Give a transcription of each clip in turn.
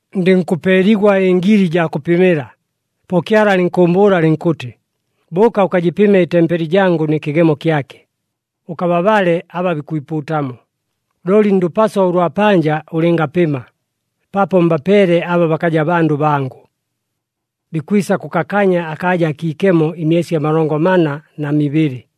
Ndɨnkʉpeeligwa ɨngili jaa kʉpɨmɨla, po Kyala alɨnkʉʉmbʉʉla alɨnkʉtɨ, “Bʉʉka ʉkajɨpɨme ɨtempeli jangʉ nɨ kɨgemo kyake, ʉkababale aba bikwipuutamo. Looli ndʉpaso ʉlwa panja ʉlɨngapɨma, paapo mbapeele aba bakaja bandʉ bangʉ. Bikwisa kʉkakanya akaaja akiikemo ɨmyesi amalongo mana na mibɨlɨ.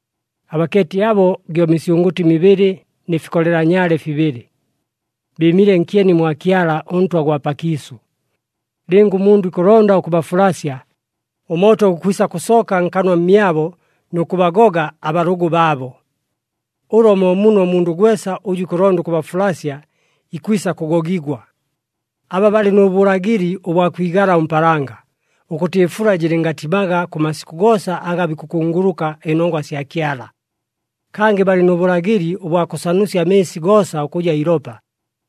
Abakeeti abo gyo misyʉngʉtɨ mibɨlɨ nɨ fikolela nyaale fibɨlɨ. Bɨɨmile nkyeni mwa Kyala, ʉNtwa gwa pakiisʉ. Lɨnga ʉmundʉ ikʉlonda ʉkʉbafulasya, ʉmooto gukwisa kʉsooka nkanwa mmyabo nʉ kʉbagoga abalʉgʉ baabo. Ʉlo mo muno ʉmundʉ gwesa ʉjʉ ikʉlonda ʉkʉbafulasya, ikwisa kʉgogigwa. Aba balɨ nʉ bʉlagɨli ʉbwa kwigala ʉmpaalanga, ʉkʉtɨ ɨfula jɨlɨngatimaga kʉ masikʉ goosa aga bikʉkunguluka ɨnongwa sya Kyala. Kangɨ balɨ nʉ bʉlagɨli ʉbwa kʉsanusya amɨɨsi goosa ʉkʉja ilopa,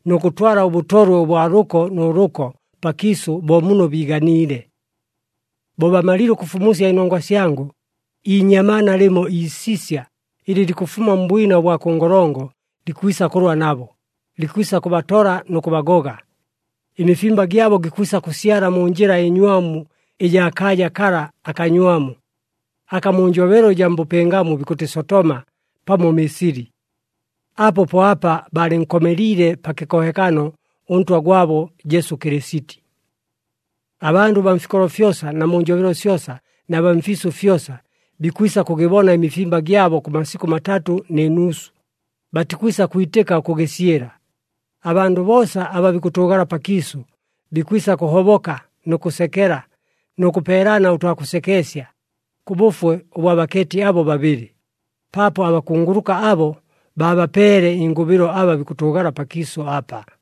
nʉ kʉtwala ʉbʉtolwe ʉbwa lʉko nʉ lʉko pakiisʉ bo muno biiganiile. Bo bamalile ʉkʉfumusya ɨnongwa syangʉ, iinyamaana lɨmo iisisya ɨlɨ likʉfuma mbwina ʉbwa kʉ ngolongo likwisa kʉlwa nabo, likwisa kʉbatola nʉ kʉbagoga. Ɨmifimba gyabo gikwisa kʉsyala mu njɨla ɨnywamu ɨjaa kaaja kala akanywamu, aka mu njobelo ɨjaa mbʉpɨngamu bikʉtɨ Sotoma pamo Misili. Apo po apa baalɨnkomeliile pa kɨkohekano ʉNtwa gwabo Jesu Kɨlɨsiti. Abandʉ baa mfikolo fyosa na mu njobelo syosa na baa mfiisʉ fyosa, bikwisa kʉgɨbona ɨmifimba gyabo kʉ masikʉ matatʉ nɨ nuusu, batikwisa kwitɨka ʉkʉgɨsyɨla. Abandʉ boosa aba bikʉtʉʉgala pakiisʉ, bikwisa kʉhoboka nʉ kʉsekela nʉ kʉpeelana ʉtwa kʉsekeesya, kʉ bʉfwe ʉbwa bakeeti abo babɨlɨ, paapo abakunguluka abo baabapeele ɨngʉbɨlo aba bikʉtʉʉgala pakiisʉ apa.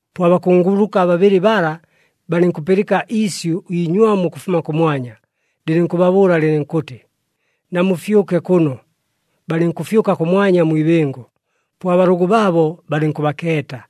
Po abakunguluka babɨlɨ bala, balɨnkʉpɨlɨka iisyʉ iinywamu ʉkʉfuma kʉmwanya, lɨlɨnkʉbabʉʉla lɨlɨnkʉtɨ, “Namufyʉke kʉno!” Balɨnkʉfyʉka kʉmwanya mwi ibɨngo, po abalʉgʉ baabo balɨnkʉbakeeta.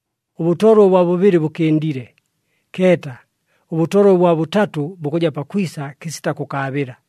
Ʉbʉtolwe ʉbwa bʉbɨlɨ bʉkɨndile. Keeta, ʉbʉtolwe ʉbwa bʉtatʉ bukʉja pakwisa kɨsita kʉkaabɨla!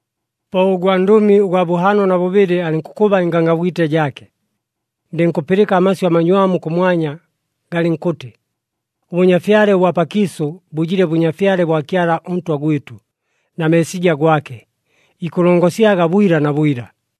Po ʉgwandʉmi ʉgwa bʉhaano na bʉbɨlɨ alɨnkʉkʉba ɨngangabwite jaake. Ndɨnkʉpɨlɨka amasyʉ amanywamu kʉmwanya, galɨnkʉtɨ, “Ʉbʉnyafyale ʉbwa pakiisʉ bʉjile Bʉnyafyale bwa Kyala ʉNtwa gwɨtʉ, na Meesija gwake, ikʉlongosyaga bwila na bwila.”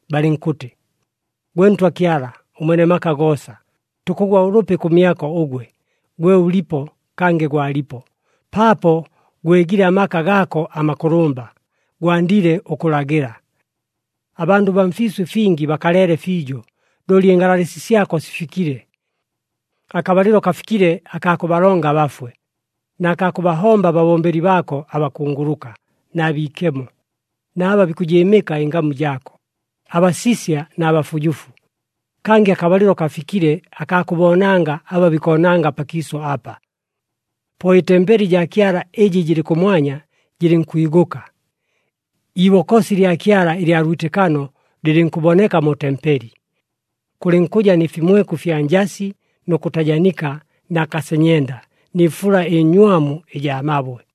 Balɨnkʉtɨ, “Gwe Ntwa Kyala ʉMwene maka goosa, tukʉgwa ʉlʉpi kʉmyako ʉgwe, gwe ʉlipo, kangɨ gwalipo, paapo gwegile amaka gaako amakʉlʉmba, gwandile ʉkʉlagɨla. Abandʉ baa mfiisʉ ɨfingi bakaleele fiijo, looli ɨngalalɨsi syako sifikile. Akabalɨlo kafikile akaa kʉbalonga abafwe, na kaa kʉbahomba ababombeli baako abakunguluka, na biikemo, na aba bikʉjɨɨmɨka ɨngamu jaako, abasisya na bafujufu, kangɨ akabalɨlo kafikile akaa kʉboonanga aba bikoonanga pakiisʉ apa.” Po ɨtempeli jaa Kyala ɨjɨ jɨlɨ kʉmwanya jɨlɨnkwigʉka. Iibokosi lya Kyala ɨlya lwitɨkano lɨlɨnkʉboneka mu tempeli. Kʉlɨnkʉja nɨ fimweku ɨfya njasi nʉ kʉtajanika na kasenyenda, nɨ fula ɨnywamu ɨjaa mabwe.